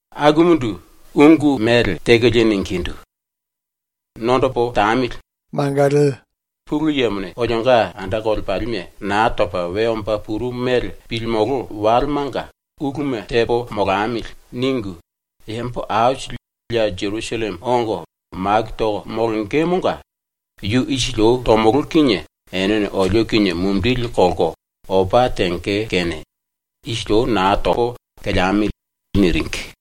Akumundu ungu mele tekolie ningindu: “⸤Nondopo tamili,⸥ nakolo Pulu Yemone olionga anda kolepalime Naa Topa We Omba Purumu Mele ⸤Pilimolo⸥ Walemanga ⸤‘uluma tepo molamili.’ ningu⸥ yambo aisili ya Jerusalleme ongo maku toko molongemonga yu isili ou tomolo kinie enene olio kinie mumindili kolko opa tenge kene isili ou naa topo, keleamili.” niringi.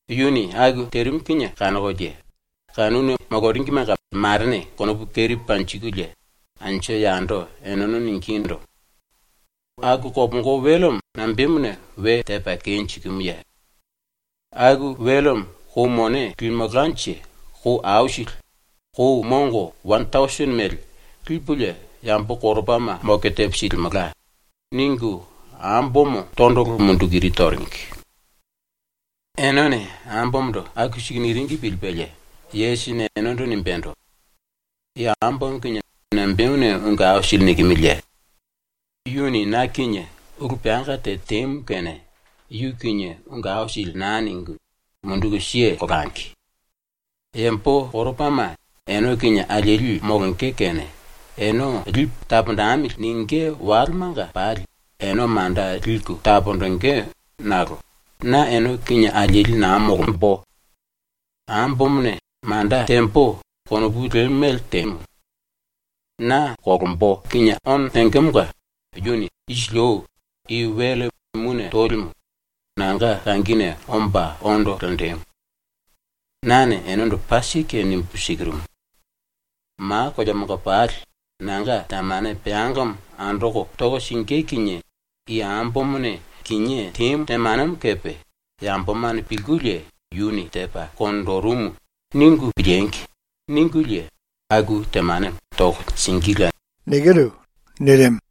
Yuni aku terimu kinie kanokolie kanuna moloringimenga marene konopu keri panjikulie anju yando eneno ningindu: “Aku kopongo welemo nambemuna we tepa kenjikimuye? Aku welemo kou mone limelkanje kou aisili, kou mongo wane tausini mele, lipulie yambo koropama moke tepo silimelka.” ningu ambomo tondolo munduku iri toringi. ⸤Enene ambomondo aku siku niringi pilipelie⸥ Yesusini enendo nimbendo: “I ambomo kinie nambemuna ungu aisili nikimiliye? Yuni na kinie ulu peanga te temu kene yu kinie ungu aisili naa ningu munduku keleangi. Yambo koropama ene kinie alieli molonge kene ‘Ene lipu taponjemili.’ ningí walemanga pali ene manda liku taponjingí nakolo na ene kinie alieli naa molombo. Ambomone ‘Manda tembo.’ konopu lemu mele temu. Na ono tengemonga yuni isili ou i wele mune tolimu nanga kangine omba ondo lenjimu. Nane enendo paa sike nimbu sikirumu: Ma koleamanga pali ⸤nanga⸥ temane peangamo andoko toko singí kinie i ambomone kinié temu temanemo kepe ‘Yambomane pilkulie ‘Yuni tepa konjirimu.’ ningu piliengi!’ ningulie aku temanemo toko singíla.” nirimu.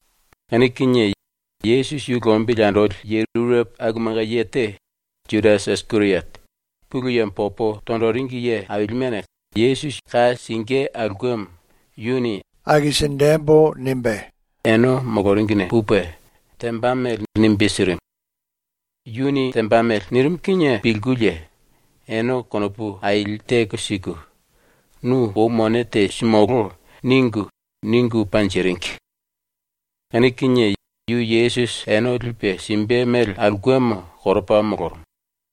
Kanu kinie ⸤Yesusi yu lombili andoli⸥ ye rurepo akumanga ye te, Judasi Isikeriote, ‘Pulu Yemo popo tonjiringi ye ailimene ka singí aulkemo yuni akisinjembo.’ nimbe ene moloringine pupe, temba mele nimbe sirimu. Yuni temba mele nirimu kinie pilkulie ene konopu aili teko siku “Nu kou mone te simulú.” ningu, ningu panjiringi. Kanu kinie yu Yesusi ene lipe simbe mele aulkemo koropa molorumu.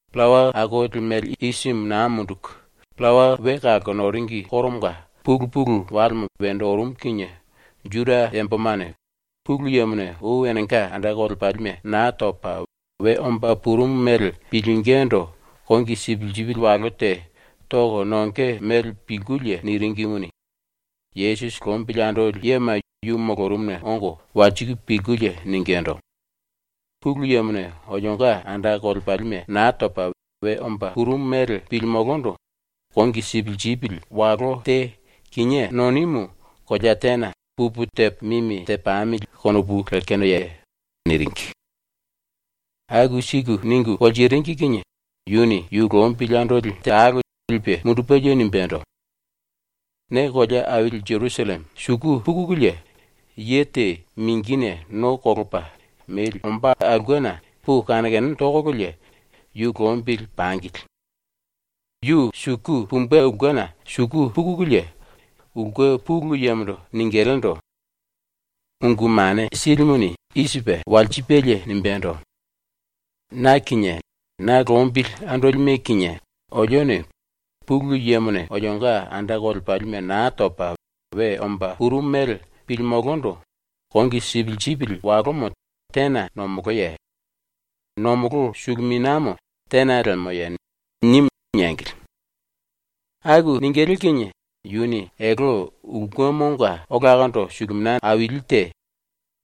Pillawa Akoli Mele Isimu Naa Munduku Pillawa We Kalko Noringi Koromonga pulu pulu walemo wendo orumu kinie Juda yambomane Pulu Yemone ou enenga anda kolepalime Naa Topa We Omba Purumu mele pilingindu kongi sipisipi walo te toko nonge mele pilkulie niringimuni, Yesusi lombili andoli yema yu molorumuna ongo walsiku pilkulie ningindu: “Pulu Yemone olionga anda kolepalime Naa Topa We Omba Purumu mele pilimulundu kongi sipisipi walo te kinié nonimu kolea tena pupu tepo mimi tepamili konopu lekenoye?” niringi. Aku siku ningu walsiringi kinie yuni yu lombili andoli talo lipe mundupelie nimbendo: “Ne kolea aili ⸤Jerusalleme⸥ suku pukululie, ye te mingine no kolopa memba ombá aulkena puku kane kane tokololie yu lombili pangili. Yu suku pumbe ulkena ⸤suku pukululie⸥, ulke pulu yemondo ningilindu: “Ungu Mane Silimuni i sipe walsipelie nimbendo: “Na kinie na lombili andolime kinie olione Pulu Yemone olionga anda kolepalime naa topa we omba purumu mele pilimulundu kongi sipisipi walomo tena nomoloye? Nomolo suluminiamo tena lemoye?” nimu.” niengili. Aku ningilí kinie yuni elte ulkemonga olakondo suluminia aili te,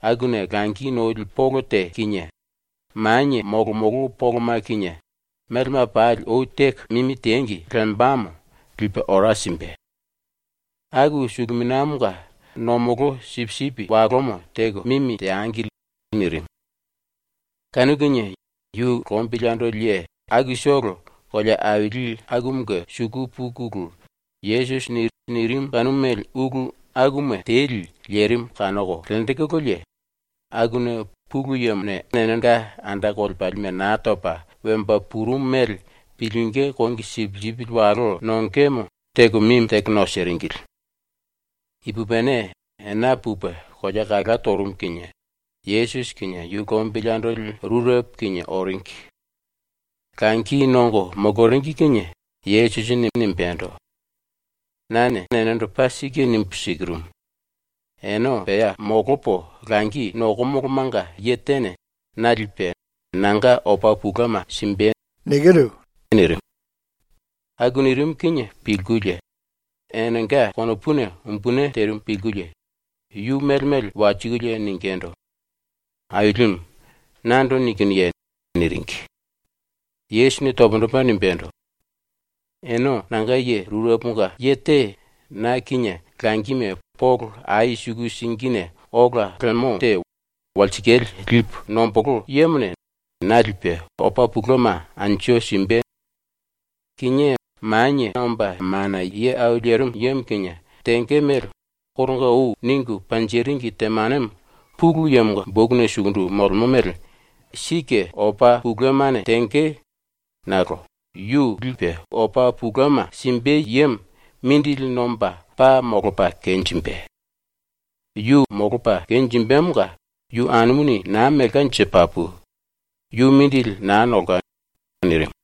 akuna langi noli polo te kinie, manie molomolo poloma kinie, melema pali ou teko mimi tengi lembamo, lipe ora simbe. Aku suluminiamonga ⸤nomolo sipisipi walomo⸥ teko mimi teangili.” nirimu. Kanu kinie yu lombili andoli ye akutolo kolea aili akumunge suku pukulu, Yesusini nirimu kanu mele ulu akuma teli lerimu kanoko lenjikululie, akuna Pulu Yemone enenga anda kolepalime naa topa we omba purumu mele pilingí kongi sipisipi walo nongemo teko mimi teko nosiringili. Ipupini ena pupe kolea kala torumu kinie Yesusi kinie yu lombili andoli rurepo kinie oringi. Langi nongo moloringi kinie Yesusini nimbendo: “Nane enendo paa sike nimbu sikirumu: Ene pea molopo langi nokomolomanga ye tene na lipe nanga opa touma simbe.” nirimu. ⸤Aku nirimu kinie pilkulie⸥ enenga konopuna umbuni terimu pilkulie yu mele mele walsikulie ningindu: “Ailimu, nando nikinuye?” niringi. Yesusini pundu topa nimbendo: “Ene nanga ye rureponga ye te na kinie langime polo ai suku singine ola lemo te walsikale lipu nombolo yemone na lipe, opa touma anju simbe.” nirimu. “Kinié Manie Omba Mana Ye Au Lerimu Yemo kinie tenge mele koronga ou ningu panjiringi temanemo ⸤Pulu Yemonga⸥ bokuna sukundu molemo mele sike opa toumane tenge, nakolo yu lipe opa touma simbe yemo mindili nomba paa molopa kenjimbe. Yu molopa kenjimbemonga yu anumuni naa melkanje papu. ⸤Yu mindili naa nolka.⸥” nirimu.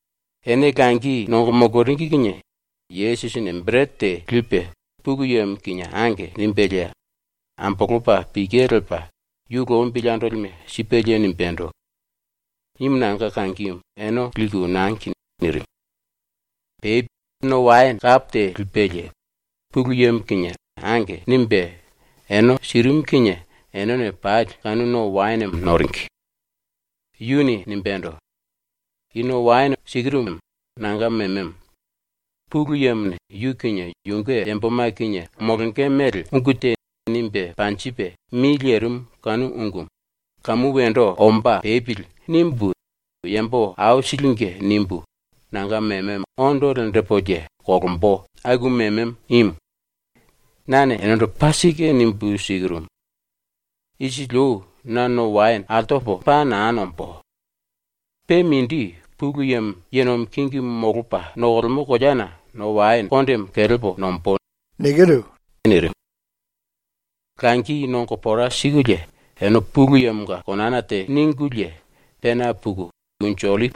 Ene langi nongo moloringi kinie Yesusini berete te lipe Pulu Yemo kinie “Ange.” nimbelie ambolopa pike lepa ⸤yu lombili andolime⸥ sipelie nimbendo: “Imu nanga kangimu ene liku ⸤nangi⸥.” nirimu. Pe no waene kapo te lipelie Pulu Yemo kinie “Ange.” nimbe ene sirimu kinie enene pali ⸤kanu no waenemo⸥ noringi. Yuni nimbendo: “I ⸤no waene⸥ sikirumu nanga mememo. Pulu Yemone ⸤yu kinie yunge yamboma kinie molonge mele⸥ ungu te nimbe panjipe mi lerimu kanu ungumu ‘Kamu wendo omba pepili.’ nimbu yambo aisilinge nimbu nanga mememo ondo lenjipulie ⸤kolombo⸥ aku mememo imu. Nane enendo paa sike nimbu sikirumu: Isili ou na no waene altopo paa naa nombó. Pe mindi, Pulu Yemo ye nomi kingimu molopa nokolemo koleana no waene kondemo kelepo nombó.” nirimu. ⸤Langi nongo pora sikulie⸥ ene Pulu Yemonga konana te ningulie, pena puku ma pangi Unju Ollipi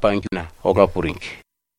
Poniena ola puringi.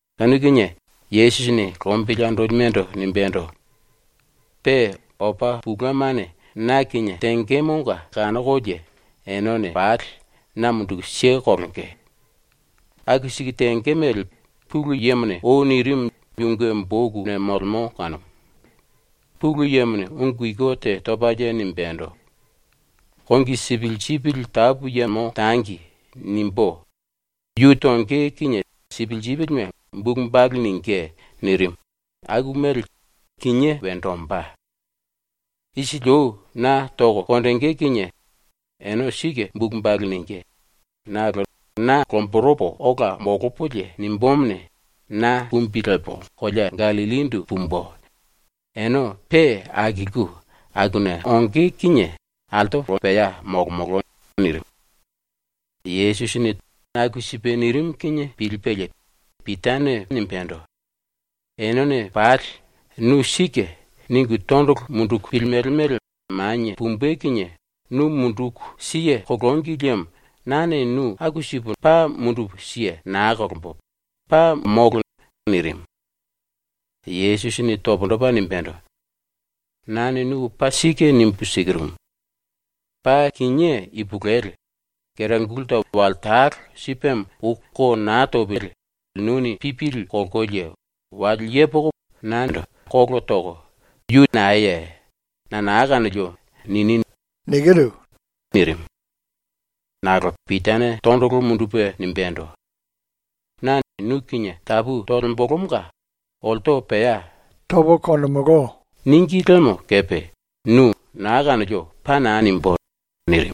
Kanu kinie Yesusini lombili andolimendo nimbendo: “Pe ⸤opa toumane na kinie tengemonga kanokolie⸥ enene pali na munduku kelenge. Aku siku tenge mele Pulu Yemone ou nirimu yunge bokuna molemo kanumu. Pulu Yemone ⸤ungu iku te topalie⸥ nimbendo: “ “Kongi sipisipi tapu yemo tangi.” nimbú, yu tonge kinie sipisipime bulu balu ningí.” nirimu, ⸤aku mele kinié wendo ombá⸥.. ⸤Isili ou na toko konjingí kinie ene sike bulu balu ningí⸥ nakolo na lomboropo ola molopolie nimbumuni, na kumbi lepo kolea Gallillindu pumbu, ene pe akilku akuna onge kinie ⸤altopo pea molomolo⸥.” nirimu. ⸤Yesusini aku sipe nirimu kinie pilipelie⸥ Pitane nimbendo: “Enene pali ‘Nu sike’ ningu tondolo munduku pilimele mele manie pumbe kinie nu munduku kelengi liemo nane nu aku sipu paa mundupu naa kelembo, paa molo.” nirimu. Yesusini pundu topa nimbendo: “Nane nu paa sike nimbu sikirumu: Paa kinié ipulueli, kera gulta wale talo sipemo ou ko naa topili nuni pipili kolkolie wale yepoko nando kolo toko “Yu naeye? Na naa kanolio.” nini.” nirimu. Nakolo Pitane tondolo mundupe nimbendo: “Na nu kinie tapu tolembolomonga olto pea “Tomolo.” níngi liemo kepe nu “Naa kanolio.” paa naa nimbú.” nirimu.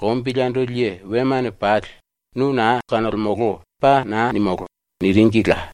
Lombili andoli ye wemane pali “ “Nu naa kanolemolo.” paa naa nimulú.” niringila.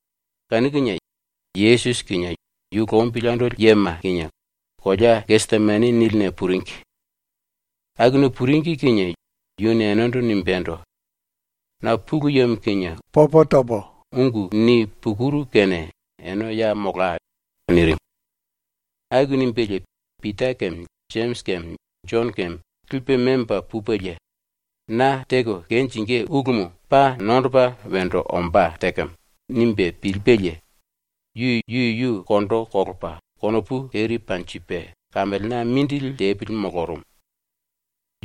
⸤Kanu kinie⸥ Yesusi kinie yu lombili andoli yema kinie kolea ‘Gesemani’ niline puringi. Akuna puringi kinie yuni enendo nimbendo: “Na Pulu Yemo kinie ungu nipukuru kene ene ya molai.” nirimu. Aku nimbelie Pita keme Jemisi keme Jono keme lipe memba pupelie ⸤‘Na teko kenjingí ulumu paa nondopa wendo ombá tekemo.’ nimbe pilipelie⸥ yu yuyu kondo kolopa konopu keri panjipe kamelena mindili tepili molorumu.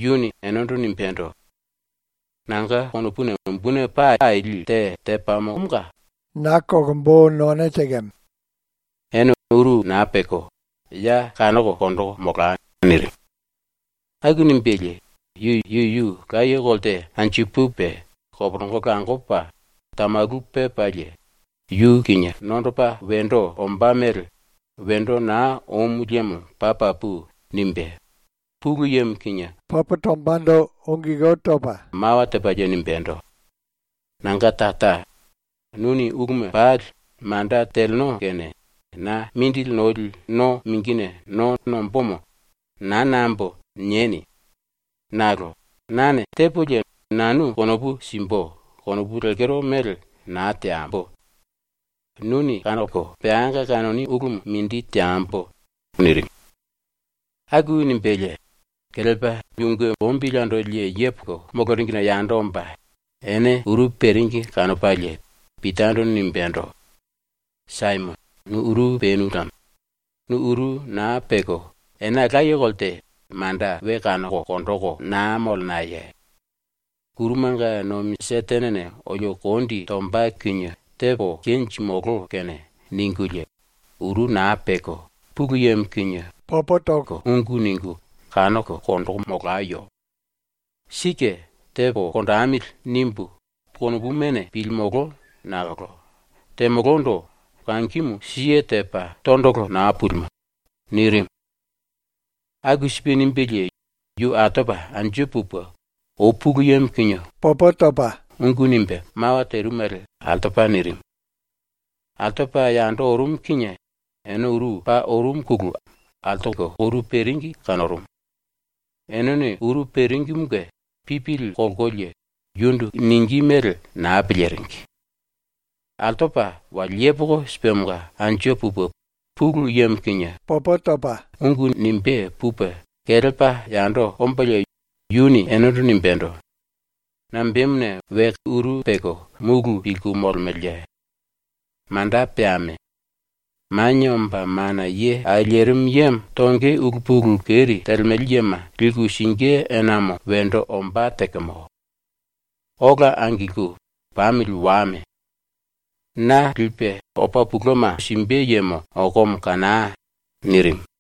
Yuni enendo nimbendo: “Nanga konopuna umbuni paa aili te tepamo kene na kolkoro none tekemo. Ene uru naa peko, ya kanoko konjiku molai.” nirimu. Aku nimbelie yu yuyu laye kolte anju pupe koporongo langopa tamalu pepalie yu kinie nondopa wendo ombá mele ‘Wendo naa omu liemo paa papu.’ nimbe Pulu Yemo kinie ungu nimbe mawa tepalie nimbendo: “Nanga Tara, nuni uluma pali manda teleno kene na mindili noli no mingine no nombómo ‘Naa nambo.’ nieni. Nakolo ‘Nane tepolie nanu konopu simbu.’ konopu lekero mele naa teambo. Nuni kanoko peanga kanoni ulumu mindi teambo.” nirimu. Aku nimbelie kelepa yunge lombili andoli ye yepoko moloringine yando omba ene uru peringi kanopalie Pitando nimbendo: “Saimono, nu uru penu lemo. Nu uru naa peko ena laye kolte manda we kanoko konjiku naa molenaye? ‘⸤Kurumanga nomi Setenene⸥ olio kondi tomba kinie tepo kenjimulú kene.’ ningulie ⸤uru naa peko⸥ Pulu Yemo kinie ungu ningu kanoko konjiku molayo. Sike ‘tepo konjemili.’ nimbu konopumane pilimolo nakolo temolondo kangimu siye tepa tondolo naa pulimo.” nirimu. Aku sipe nimbelie yu altopa anju pupe ou Pulu Yemo kinie ungu nimbe mawa terimu mele altopa nirimu. Altopa yando orumu kinie ene uru paa orumuna altoko uru peringi kanorumu. Enene uru peringimunge pipili kolkolie yundu ningí mele naa piliringi. ⸤Altopa⸥ wale yepoko sipemonga ⸤anju pupe Pulu Yemo kinie ungu nimbé pupe⸥ kelepa yando ombalie yuni enendo nimbendo: “Nambemuna we uru peko múlu pilku molemeleye? Manda peame! Manie Omba Mana Ye Au Lerimu Yemo ⸤tonge⸥ ulu pulu keri telemele yema liku singí enamo wendo ombá tekemo. Ola angilku pamili wame! Na lipe anju simbe yemo okomo kanai!” nirimu.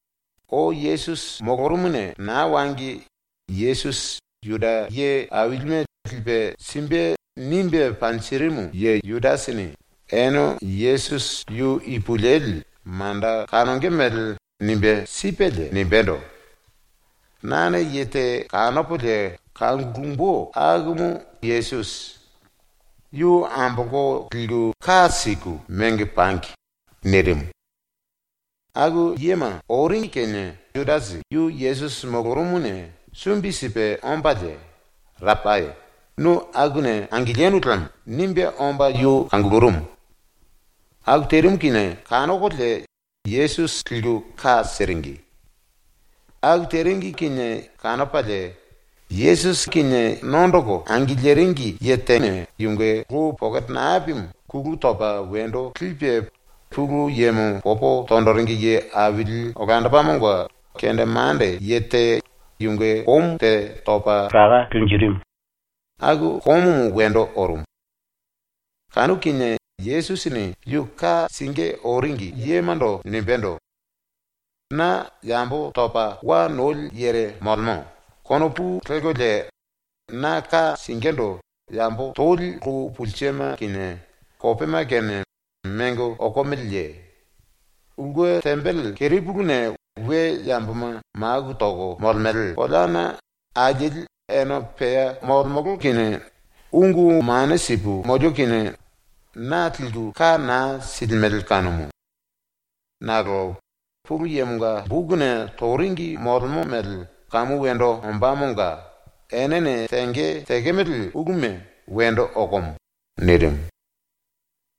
Ou Yesusi molorumuna naa wangi Yesusi Juda ye ailime lipe simbe nimbe panjirimu ye ⸤Judasini⸥ ene Yesusi yu ipulueli manda kanonge mele nimbe sipelie nimbendo: “Nane ye te kanopolie kangulumbu akumu Yesusi. Yu ambolko ka siku mengo pangi.” nirimu. ⸤Aku yema⸥ oringi kinie ⸤Judasi⸥ yu Yesusi molorumuna sumbi sipe ombalie “Rapai, nu akuna angilinu lemo.” nimbe omba yu kangulurumu. Aku terimu kinie kanokolie Yesusi liku ka siringi. Aku teringi kinie kanopalie ⸤Yesusi kinie⸥ nondoko angiliringi ye tenga lou pokete napimu kulu topa wendo lipe Pulu Yemo popo tonjiringi ye aili olandopamonga kendemande ye te yunge komu te topa laka lenjirimu, aku komumu wendo orumu. Kanu kinie Yesusini ⸤yu ka singí oringi⸥ yemando nimbendo: “Na ‘yambo topa wa noli yere molemo.’ konopu lelkolie na ka singíndu yambo toli lou pulsema kinie kopema kinie mengo okomeleye? Ulke tembele ⸤kerepuluna we yamboma maku toko molemele⸥ koleana alieli ene pea molemolo kinie ungu mane sipu molio kinie na liku ka naa silimele kanumu. Nakolo ⸤Pulu Yemonga⸥ bokuna toringi molemo mele kamu wendo ombámonga enene tenge tekemele uluma wendo okomo.” nirimu.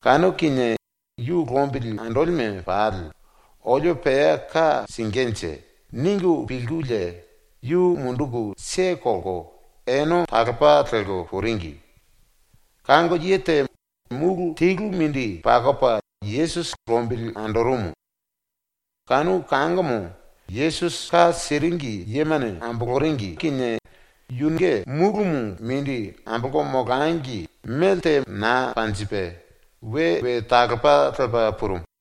Kanu kinie yu lombili andolime pali ⸤‘Olio pea ka singínje.’ ningu pilkulie⸥ yu munduku kelko ene talopa lelko puringi. Kango ye te múlu telu mindi pakopa Yesusi lombili andorumu. Kanu kangomo ⸤Yesusi ka siringi yemane⸥ amboloringi kinie yunge múlumu ⸤mindi⸥ ambolko molangi, melte naa panjipe we we talopa lepa purumu.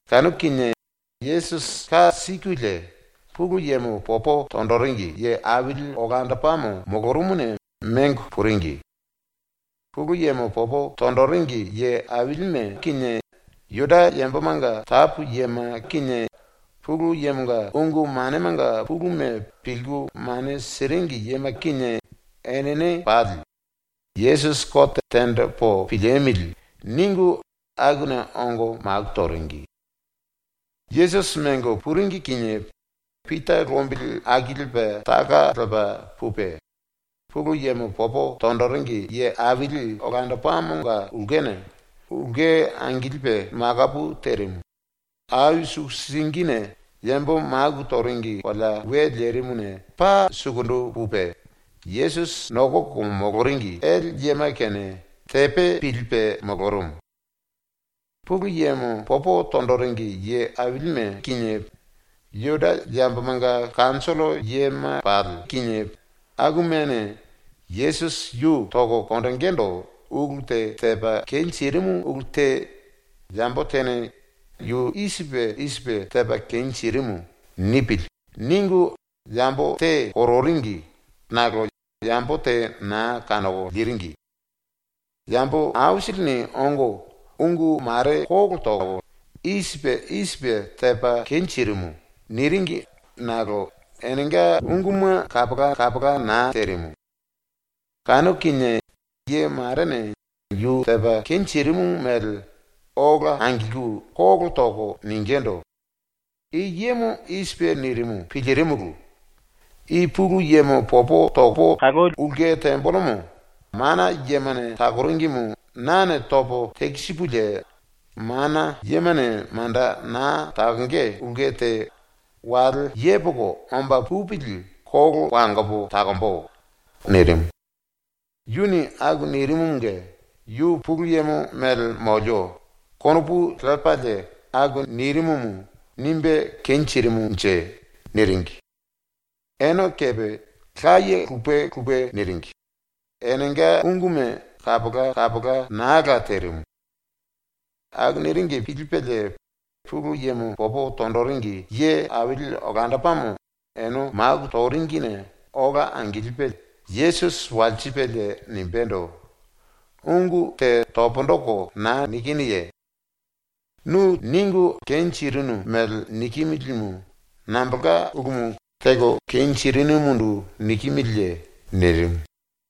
Kanu kinie Yesusi ⸤ka sikulie⸥ Pulu Yemo popo tonjiringi ye aili olandopamo molorumuna mengo puringi. Pulu Yemo popo tonjiringi ye ailime kinie, Juda yambomanga tapu yema kinie, ⸤Pulu Yemonga⸥ ungu manemanga puluma pilku mane siringi yema kinie, enene pali ⸤‘Yesusi kote tenjipu piliemili.’ ningu⸥ akuna ongo maku toringi. Yesusi ⸤mengo puringi⸥ kinie Pita lombili akilipe taka lepa pupe, Pulu Yemo popo tonjiringi ye aili olandopamonga ulkena, ulke angilipe makaye terimu, ai suku singine yambo maku toringi kolea we lerimuna paa sukundu pupe, ⸤Yesusi nokoko moloringi⸥ ele yema kinie tepe pilipe molorumu. Pulu Yemo popo tonjiringi ye ailime kinie, Juda yambomanga kanjollo yema pali kinie, akumane Yesusi yu toko konjingindu ulu te tepa kenjirimu ulu te ‘Yambo tene ‘yu i sipe i sipe tepa kenjirimu.’ nipili.’ ningu yambo te kororingi nakolo yambo te naa kanoko liringi. Yambo aisilini ongo ungu mare kolo toko “I sipe i sipe tepa kenjirimu.” niringi nakolo enenga unguma kapola naa terimu. Kanu kinie ye marene yu tepa kenjirimu mele ola angilku kolo toko ningindu: “I yemo i sipe nirimu pilirimulu: “I ⸤Pulu Yemo popo toko kalemolo⸥ ulke tembelemo, mana yemane takoringimu nane topo tekisipulie mana yemane manda naa takonge ulke te wale yepoko omba pupili kolo wangopo takombo.” nirimu. ⸤Yuni aku nirimumunge ‘Yu Pulu Yemo mele molio.’ konopu lepalie aku nirimumu nimbe kenjirimunje⸥.” niringi. Ene kepe laye lupe lupe niringi, enenga unguma kapola naa la terimu. Aku niringi pilipelie Pulu Yemo popo tonjiringi ye aili olandopamo ene maku toringine ola angilipe Yesusi walsipelie nimbendo: “Ungu te pundu toko naa nikinuye? Nu teko kenjirinu mele nikimilimu nambolka ulumu teko kenjirinumundu nikimiliye?” nirimu.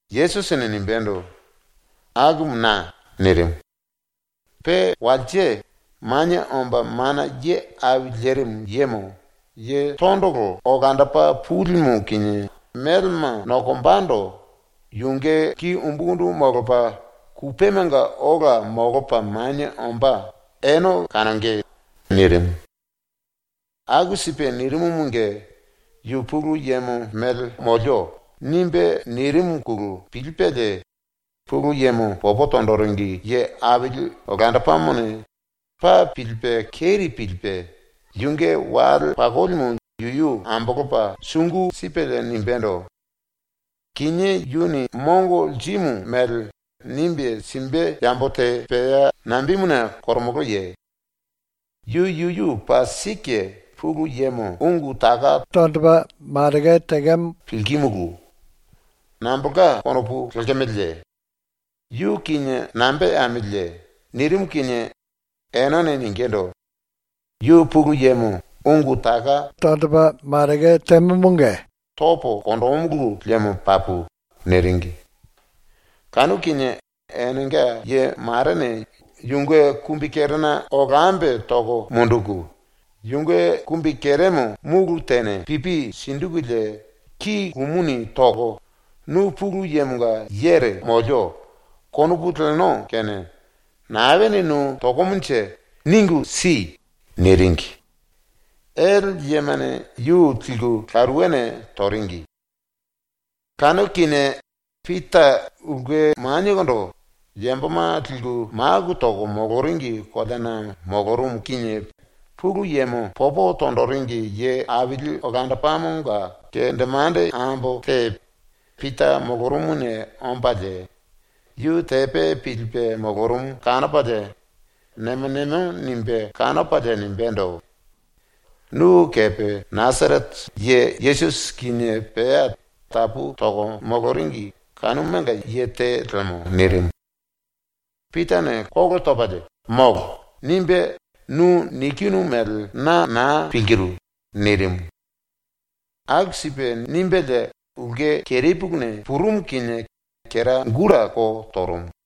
Yesusini nimbendo: “Akumu na.” nirimu. “Pe walse Manie Omba Mana Ye Au Lerimu Yemo, Ye Tondolo Olandopa Pulimu ⸤kinie melema nokombando⸥ yunge ki umbukundu molopa, kupemanga ola molopa manie ombá ene kanonge.” nirimu. Aku sipe nirimumunge ⸤yu ‘Pulu Yemo mele molio.’ nimbe nirimuna⸥ pilipelie Pulu Yemo popo tonjiringi ye aili olandopamone ⸤paa pilipe keri pilipe⸥ yunge wale pakolimu yuyu ambolopa sungu sipelie nimbendo: “Kinié yuni mongo lirimu mele nimbe simbe yambo te pea nambemuna koromoloye? Yu yuyu paa sike Pulu Yemo ungu taka tonjikimu pilkimulu. Nambolka konopu lekemeleye? ⸤Yu kinie nambe teamiliye?⸥” nirimu kinie enene ningindu: “Yu Pulu Yemo ungu taka tonjimumunge topo konjímulu liemo papu.” niringi. Kanu kinie enenga ye marene yunge kumbikerena lkambe toko munduku, yunge kumbikeremo múlu tene pipi sinjikulie ki lumuni toko ⸤“Nu ‘Pulu Yemonga yere molio.’ konopu leno kene⸥ naene nu tokomonje ningu si!” niringi. Ele yemane yu liku laruwene toringi. Kanu kinie Pita ulke maniekondo, yamboma liku maku toko moloringi koleana molorumu kinie Pulu Yemo popo tonjiringi ye aili olandopamonga kendemande ambo te Pita molorumuna ombalie yu tepe pilipe molorumu kanopalie nemo nemo nimbe kanopalie nimbendo: “Nu kepe Nasarete ye Yesusi kinie pea tapu toko moloringi kanumanga ye te lemo.” nirimu. Pitane kolo topalie “Molo!” nimbe “Nu nikinu mele na naa pilkiru!” nirimu. Aku sipe nimbelie ulke kerepuluna purumu kinie kera gulta ko torumu.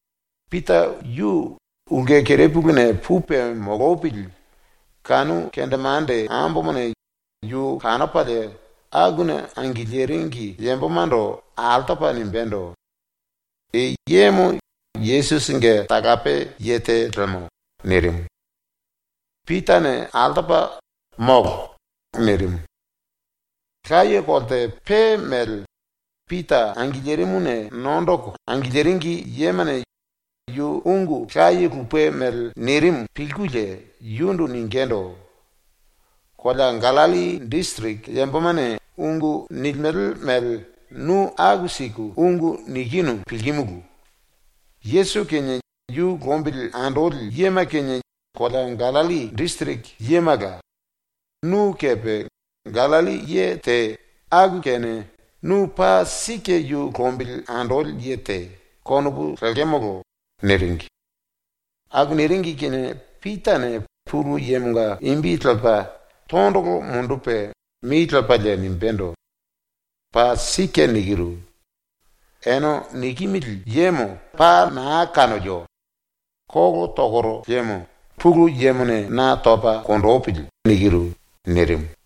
Pita yu ulke kerepuluna pupe molopili kanu kendemande ambomone yu kanopalie akuna angiliringi yambomando altopa nimbendo: “I yemo Yesusinge talape ye te lemo.” nirimu. Pitane altopa “Molo!” nirimu. Laye kolte pe mele Pita angilirimuna nondoko angiliringi yemane ⸤yu ungu laye lupe mele nirimu pilkulie⸥ yundu ningindu: “Kolea Gallilli disiriki yambomane ungu nilimele mele nu aku siku ungu nikinu pilkimulu. ⸤Yesusi kinie yu lombili andoli yema kinie kolea Gallilli disiriki yemala,⸥ nu kepe Gallilli ye te, aku kene ‘Nu paa sike yu lombili andoli ye te.’ konopu lekemolo.” niringi. Aku niringi kinie Pitane Pulu Yemonga imbi lepa tondolo mundupe mi lepalie nimbendo: “Paa sike nikiru. Ene nikimili yemo paa naa kanolio! Kolo tokoro liemo Pulu Yemone na topa konjipili.” nirimu.